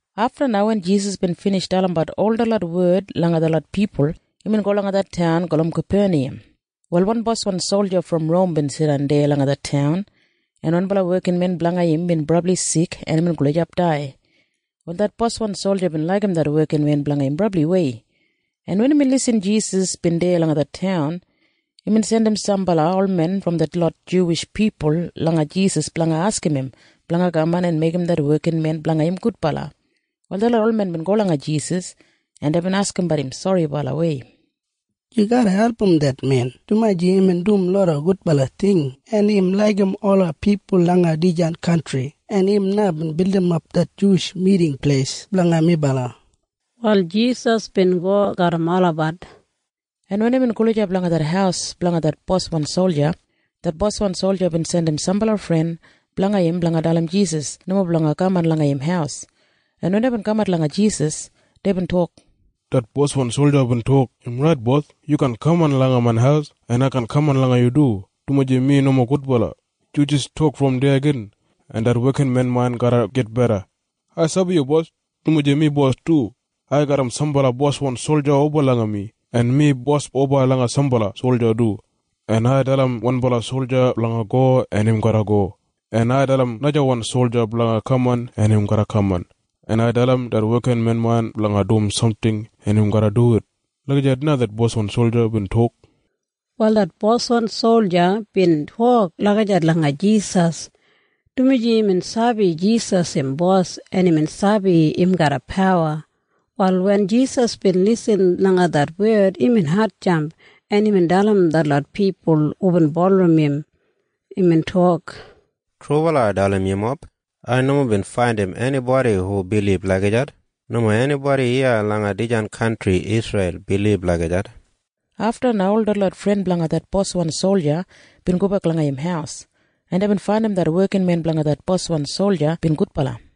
Afta na wen Jisas bin binij dalimbat ol detlot wed langa detlot pipul, imbin go langa det taun gulum Kapeniyam. Wal wan boswan solja brom Rom bin jidan deya langa det taun, en wanbala wekinmen blanga im bin brabli sik en imbin gulijap dai. Wal det boswan solja bin laigim det wekinmen blanga im brabliwei, en wen imbin irrim Jisas bin deya langa det taun, imbin jandim sambala olmen brom detlot Juwish pipul langa Jisas blanga askim im blanga kaman en meigim det wekinmen blanga im gudbala. Wal detlot olmen bin go langa Jisas, en deibin askimbat im soribalawei, “Yu garra album det men, dumaji imbin dum loda gudbala ting, en im laigim ola pipul langa dijan kantri, en im na bin bildimap det Juwish Miting Pleis blanga melabat.” Wal Jisas bin go garram olabat, en wen imbin gulijap langa det haus blanga det boswan solja, det boswan solja bin jandim sambala fren blanga im blanga dalim Jisas nomo blanga kaman langa im haus, en wen deibin kamat langa Jisas, deibin tok, “Det boswan solja bin tok, ‘Im rait, bos. Yu kaan kaman langa main haus, en ai kaan kaman langa yu du, dumaji mi nomo gudbala. Yu jis tok brom deya gin, en det wekinmen main garra gitbeda. Ai sabi yu bos, dumaji mi bos du. Ai garram sambala boswan solja oba langa mi, en mi bos oba langa sambala solja du. En ai dalim wanbala solja blanga go, en im garra go. En ai dalim najawan solja blanga kaman, en im garra kaman. En ai dalim det wekinmen main blanga dum samting, en im garra duwit.’ Lagijat na det boswan solja bin tok.” Wal det boswan solja bin tok lagijat langa Jisas, dumaji imbin sabi Jisas im bos, en imbin sabi im garram pawa. Wal wen Jisas bin irrim det wed, imbin hatjamp, en imbin dalim detlot pipul hubin bulurrum im. Imbin tok, “Trubala ai dalim yumob. Ai nomo bin faindim enibodi hu bilib lagijat. Nomo enibodi iya langa dijan kantri Isreil bilib lagijat.” Afta na ol detlot fren blanga det boswan solja bin gobek langa im haus, en deibin faindim det wekinmen blanga det boswan solja bin gudbala.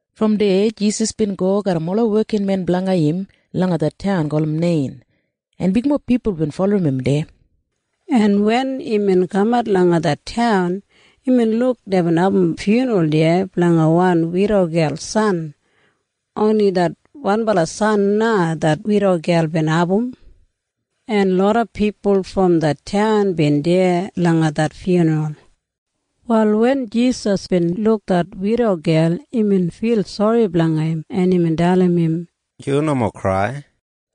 Brom deya Jisas bin go garram ola wekinmen blanga im langa det taun gulum Nein, en bigmob pipul bin bulurrum im deya, en wen imbin kamat langa det taun, imbin luk deibin abum fyunral deya blanga wan widogel san. Oni det wanbala san na det widogel bin abum, en loda pipul brom det taun bin deya langa det fyunral. Wal wen Jisas bin luk det widogel, imbin fil sori blanga im, en imbin dalim im, “Yu nomo krai.”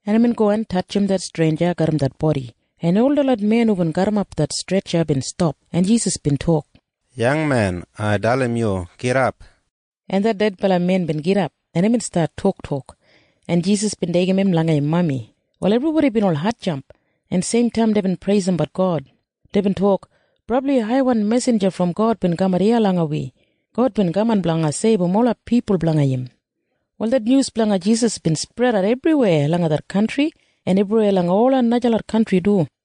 En imbin go en tatjim det stretja garram det bodi, en ol detlot men hubin garrimap det stretja bin stap, en Jisas bin tok, “Yangmen, ai dalim yu. Gidap!” En det dedbala men bin gidap, en imbin stat toktok, en Jisas bin deigim im langa im mami. Wal ebribodi bin ol hatjamp, en seimtaim deibin preisimbat God. Deibin tok, “Brabli haiwan mesinja brom God bin kamat iya langa wi! God bin kaman blanga seibum ola pipul blanga im!” Wal det nyus blanga Jisas bin spredat ebriweya langa det kantri en ebriweya langa ola najalot kantri du.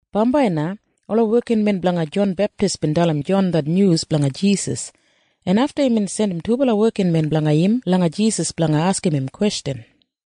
Bambai na ola wekinmen blanga Jon Beptis bin dalim Jon det nyus blanga Jisas, en afta imbin jandim dubala wekinmen blanga im langa Jisas blanga askim im kwestjan,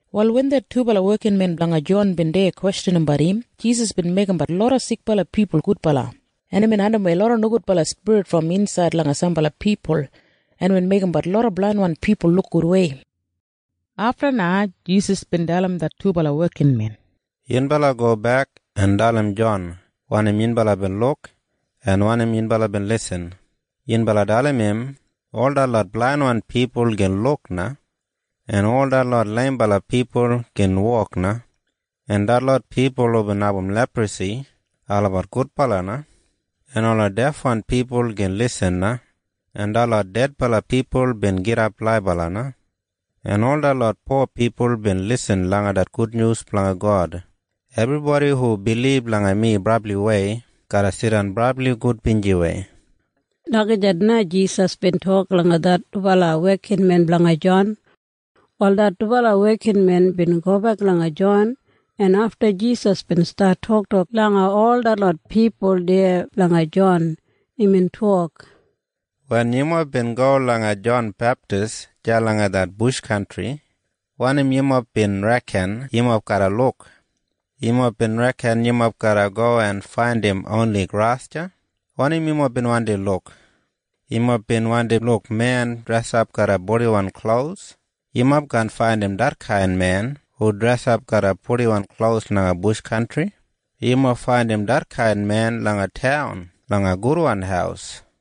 Wal wen det dubala wekinmen blanga Jon bin deya kwestjanimbat im, Jisas bin meigimbat loda sikbala pipul gudbala, en imbin andimwei loda nogudbala spirit brom insaid langa sambala pipul, en imbin meigimbat loda blainwan pipul luk gudwei. Afta na Jisas bin dalim det dubala wekinmen, “Yunbala gobek en dalim Jon wanim yunbala bin luk en wanim yunbala bin lisin. Yunbala dalim im ol detlot blainwan pipul gin luk na, en ol detlot leimbala pipul gin wok na, en detlot pipul hubin abum leprasi olabat gudbala na, en ola defwan pipul gin lisin na, en detlot dedbala pipul bin gidap laibala na, en ol detlot po pipul bin lisin det gudnyus blanga God. Ebribodi hu bilib langa mi brabliwei garra jidan brabli gudbinjiwei.” Lagijat na Jisas bin tok langa det dubala wekinmen blanga Jon. Wal det dubala wekinmen bin gobek langa Jon, en afta Jisas bin stat toktok langa ol detlot pipul deya blanga Jon. Imbin tok, “Wen yumob bin go langa Jon Beptis deya langa det bush kantri, wanim yumob bin reken yumob garra luk? Yumob bin reken yumob garra go en faindim oni gras deya? Wanim yumob bin wandi luk? Yumob bin wandi luk men dresap garram purdiwan klos? Yumob kaan faindim detkain men hu dresap garram purdiwan klos langa bush kantri. Yumob faindim detkain men langa taun langa gudwan haus.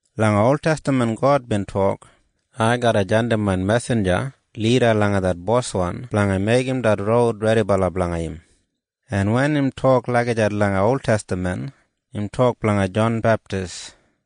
Langa oltestaman God bin tok, ‘Ai garra jandim main mesinja lida langa det boswan blanga meigim det roud redibala blanga im.’ En wen im tok lagijat langa oltestaman, im tok blanga Jon Beptis.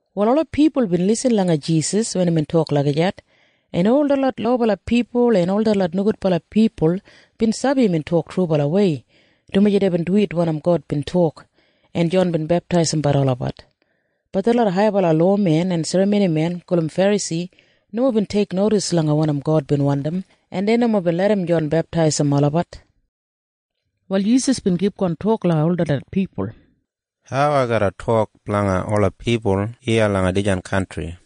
Wal ola pipul bin lisin langa Jisas wen imbin tok lagijat, en ol detlot lobala pipul en ol detlot nogudbala pipul bin sabi imbin tok trubalawei, dumaji deibin duwit wanim God bin tok, en Jon bin beptaisim olabat. Bat detlot haibala lowamen en serramonimen gulum Ferasi nomo bin teiknodis langa wanim God bin wandim, en dei nomo bin larram Jon beptaisim olabat. Wal Jisas bin kipgon tok langa ol detlot pipul, “Hau ai garra tok blanga ola pipul iya langa dijan kantri?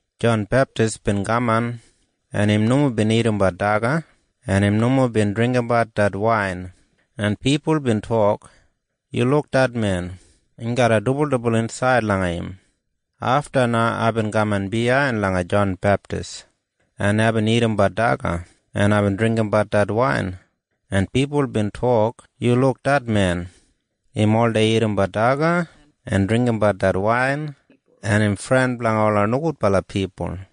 Jon Beptis bin kaman, en im nomo bin dagadagat daga, en im nomo bin dringgimbat det wain. En pipul bin tok, ‘Yu luk det men. Im garram dibuldibul insaid langa im.’ “Afta na aibin kaman biyain langa Jon Beptis, en aibin dagadagat daga, en aibin dringgimbat det wain. En pipul bin tok, ‘Yu luk det men. Im oldei dagadagat daga en dringgimbat det wain, en im fren blanga ola nogudbala pipul.’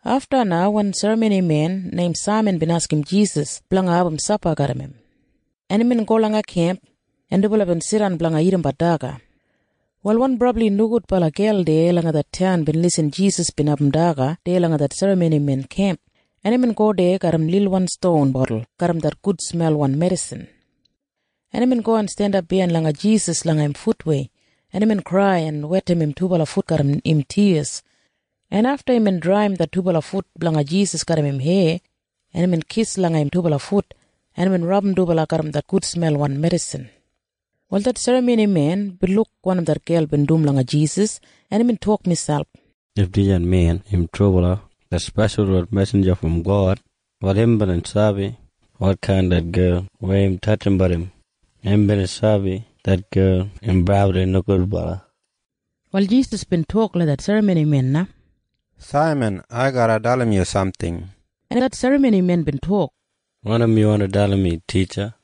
Afta na wan serramonimen neim Saiman bin askim Jisas blanga abum sapa garram im, en imbin go langa im kemp, en dubala bin jidan blanga dagat daga. Wal wan brabli nogudbala gel deya langa det taun bin irrim Jisas bin abum sapa deya langa det serramonimen kemp, en imbin go deya garram lilwan ston botul garram det gudsmelwan medisin, en imbin go en jandap biyain langa Jisas langa im futwei, en imbin krai en wetim im dubala fut garram im tiyas, en afta imbin draiyim det dubala fut blanga Jisas garram im heya, en imbin kis langa im dubala fut, en imbin rabum dubala garram det gudsmelwan medisin. Wal det serramonimen bin luk wanim det gel bin dum langa Jisas, en imbin tok miselp, “If dijan men im trubala det speshalwan mesinja brom God, wal im bina sabi wotkain det gel weya im tatjimbat im. Im bina sabi det gel im brabli nogudbala.” Wal Jisas bin tok langa det serramonimen na, “Saiman, ai garra dalim yu samting.” En det serramonimen bin tok, “Wanim yu wandi dalim mi, titja?”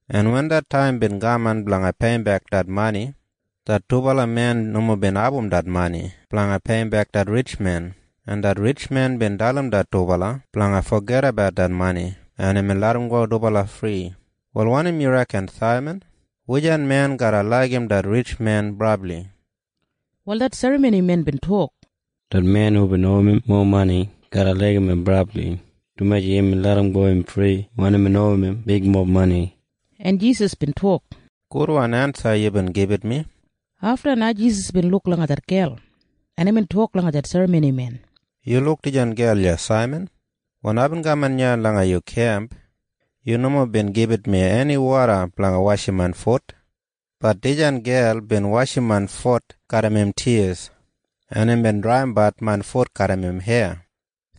en wen det taim bin kaman blanga peiyimbek det mani, det dubala men nomo bin abum det mani blanga peiyimbek det ritjmen, en det ritjmen bin dalim det dubala blanga fogedabat det mani, en imbin larramgo dubala fri. “Wal wanim yu reken, Saiman? Wujan men garra laigim det ritjmen brabli?” Wal det serramonimen bin tok, “Det men hubin owim im mowa mani garra laigim im brabli, dumaji imbin larramgo im fri wen imbin owim im bigmob mani.” En Jisas bin tok, “Gudwan ensa yubin gibit mi.” Afta na Jisas bin luk langa det gel, en imbin tok langa det serramonimen, “Yu luk dijan gel iya, Saiman? Wen aibin kaman iya langa yu kemp, yu nomo bin gibit mi eni woda blanga washim main fut. Bat dijan gel bin washim main fut garram im tiyas, en imbin draiyimbat main fut garram im heya.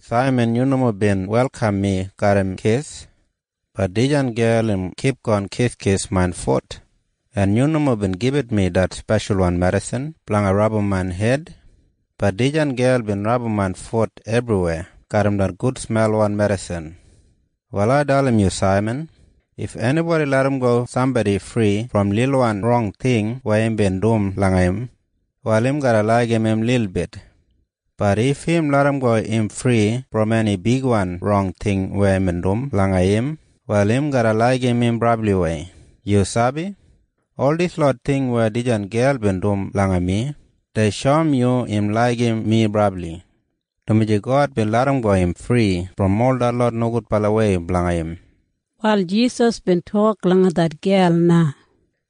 “Saiman, yu nomo bin welkam mi garram kis. Bat dijan gel im kipgon kiskis main fut. En yu nomo bin gibit mi det speshalwan medisin blanga rabum main hed. Bat dijan gel bin rabum main fut ebriweya garram det gudsmelwan medisin. “Wal ai dalim yu, Saiman. If enibodi larramgo sambodi fri brom lilwan rong ting weya imbin dum langa im, wal im garra laigim im lilbit. Bat if im larramgo im fri brom eni bigwan rong ting weya imbin dum langa im, wal im garra laigim im brabliwei. “Yu sabi? Ol dislot ting weya dijan gel bin dum langa mi, dei shoum yu im laigim mi brabli, dumaji God bin larramgo im fri brom ol detlot nogudbalawei blanga im.” Wal Jisas bin tok langa det gel na,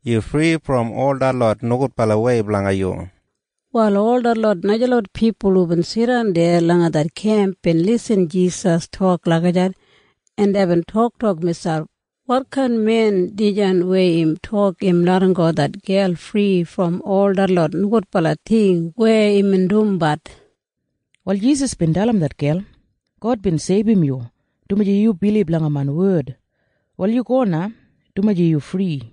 “Yu fri brom ol detlot nogudbalawei blanga yu.” Wal ol detlot najalot pipul hubin jidan deya langa det kemp bin irrim Jisas tok lagijat, en deibin toktok miselp, “Wotkain men dijan weya im tok im larramgo det gel fri brom ol detlot nogudbala ting weya imbin dumbat?” Wal Jisas bin dalim det gel, “God bin seibum yu, dumaji yu bilib langa main wed. Wal yu go na, dumaji yu fri.”